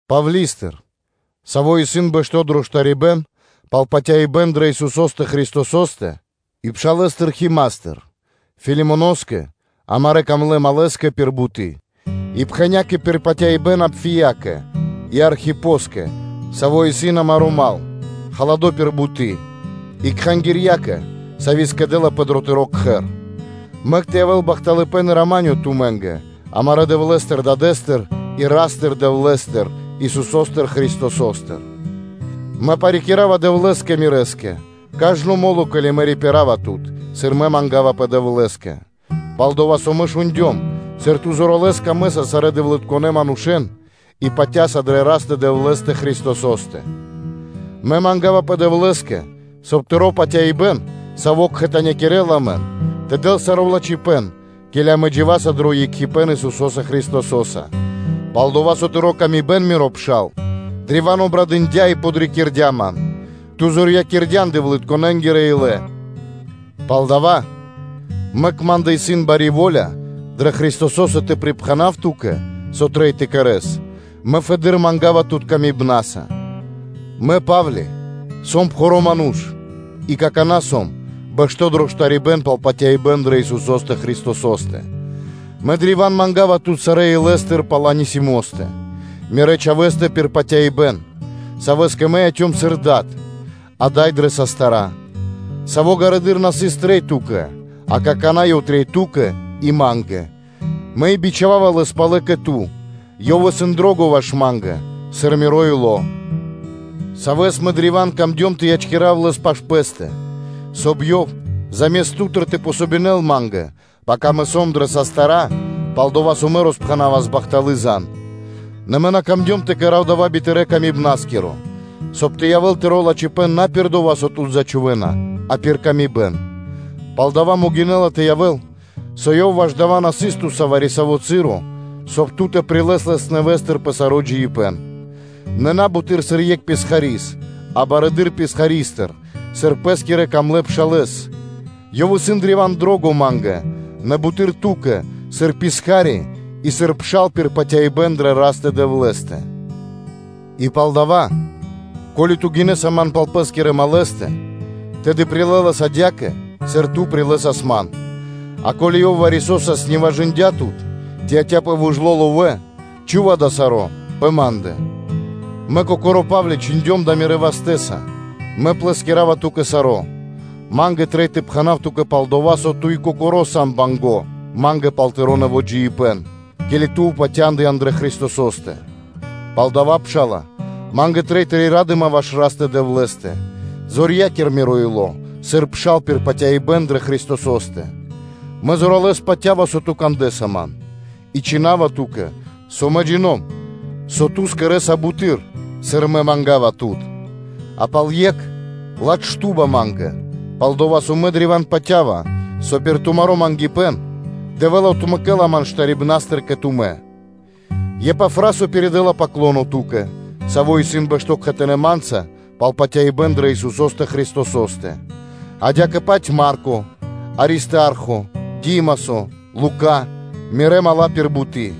Павли́стыр, саво́ исын дро штарибэ́н пал патяибэ́н дрэ Исусо́стэ Христосо́стэ и пшалэстыр Химастыр, Филимоно́скэ, амарэ́ малэ́скэ пир буты́, и пхэня́кэ пир патяибэ́н Амфия́кэ, и Архимо́скэ, саво́ исын амаро́ мал – халадо́ пир буты́, и кхангирья́кэ, сави́ скэдэлапэ дро тыро́ кхэр. Мэк тэ явэ́л бахталыпэ́н и рама́нё (миро) тумэ́нгэ амарэ́ Дэвлэ́стыр Дадэ́стыр и Ра́стыр-Дэвлэ́стыр, Исусо́стыр Христосостыр. Мэ парикирава Дэвлэ́скэ Мирэ́скэ каждо мо́ло, ке́ли мэ рипирава тут, сыр мэ мангавапэ Дэвлэ́скэ, пал-дова́ со мэ шундём, сыр ту зоралэ́с сыкавэса паты́в сарэ́ дэвлытконэ́ манушэ́нгэ и патя́са дрэ Растэ-Дэвлэ́стэ Христосо́стэ. Мэ мангавапэ Дэвлэ́скэ, соб (кай) тыро́ патяибэ́н, саво́ кхэтанякирэла амэн, тэ дэл саро́ лачхипэ́н, ке́ли амэ дживаса дрэ екхипэ́н Исусо́са Христосо́са. Пал-дова́ со тыри́ паты́в кэ яви́р мануша́, ми́ро пша́л, древа́н обрадындя и подрикирдя ман; ту зорьякирдян дэвлытконэнгирэ илэ́. Палдава́, мэк ма́ндэ исын бари во́ля дрэ Христосо́стэ тэ припхэнав ту́кэ, со трэй тэ кэрэ́с, нэ мэ фэды́р манга́ва тут илэ́са, мэ, Па́вли, сом пхуро́, и какана́ сом дро штарибэ́н пал патяибэ́н дрэ Исусо́стэ Христосо́стэ. Мэ древа́н манга́ва тут сарэ́ илэ́стыр пал Анисимостэ, мирэ́ чхавэ́стэ пир патяибэ́н, савэ́скэ мэ яцём сы́рбы дад, ада́й, дрэ састыра́, саво́ ґарэдыр на сыс трэй ту́кэ, а какана́ ёв трэй ту́кэ и ма́нгэ: мэ и бичхава́ва лэс палэ кэ ту: ёв исын дро́го ваш ма́нгэ, сыр миро ило́: савэ́с мэ древа́н камдём (мангдём) тэ ячкирав лэс паш пэ́стэ, соб (кай) ёв заме́ст ту́тэ тэ помогинэл ма́нгэ, пака мэ сом дрэ састыра́, пал-дова́, со мэ роспхэнавас бахталы́ зан (звесь); нэ мэ на камдём тэ кэра́в дава́ би тырэ́-лавэскиро, соб (кай) тэ явэ́л тыро́ лачхипэ́н на пир дова́, со тут зачхувэна, а пир ило́; палдава́ могинэ́ла тэ явэ́л, со ёв ваш дава́ на сыс ту́са вари-саво́ часо, соб (кай) ту тэ прилэс лэс нэвэ́стыр пэ саро́ джиибэ́н; нэ на буты́р сыр екхэ́ дынари́с (слугас), а барэды́р дынари́стыр, сыр пэ́скирэ дрогонэ́ пшалэ́с, ёв исын древа́н дро́го ма́нгэ, нэ буты́р ту́кэ, сыр ману́ш и сыр пшал пир патяибэ́н дрэ Растэ-Дэвлэ́стэ. И палдава́, ко́ли ту гинэса ман пал пэ́скирэ малэ́стэ (другостэ), тэды прилэ́ лэс адя́кэ, сыр ту прилэсас ман: и, ко́ли ёв вари-со́са дукхадя тут ци яця́пэ вужло ловэ́, чхув саро́ пэ ма́ндэ. Мэ, кокоро́ Па́вли, чхиндём дава́ мирэ́ вастэ́са, мэ плэскирава ту́кэ саро́: ма́нгэ трэй тэ пхэна́в ту́кэ пал дова́, со ту и кокоро́ сан банго́ ма́нгэ пал тыро́ нэво́ джиибэ́н, ке́ли ту упатяндыян дрэ Христосо́стэ. Палдава́, пша́ла, ма́нгэ трэй тыри́ ра́дыма ваш Растэ-Дэвлэ́стэ; зорьякир миро ило́, сыр пшал пир патяибэ́н дрэ Христосо́стэ. Мэ зоралэ́с патя́ва, со ту кандэса ман, и чхина́ва ту́кэ, со мэ джино́м, со ту кэрэ́са буты́р, сыр мэ манга́ва тут. А пал екх латх шту́ба (камо́ра) ма́нгэ, пал-дова́ со мэ древа́н патя́ва, со пир тумаро́ мангипэ́н Дэвэ́л отмэкэ́ла ман штарибнастыр кэ тумэ́. Епафрасо пиридэ́ла “паклоно” ту́кэ, саво́ исын бэшто́ кхэтанэ́ ма́нца пал патяибэ́н дрэ Исусо́стэ Христосо́стэ: адя́кэ-паць Марко, Аристархо, Димасо, Лука – мирэ́ мала́ пир буты́.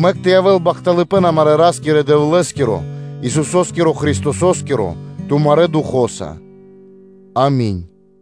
Мэк тэ явэ́л бахталыпэ́н амарэ́ Ра́скирэ-Дэвлэ́скиро, Исусо́скирэ Христосо́скиро тумарэ́ духо́са. Ами́нь.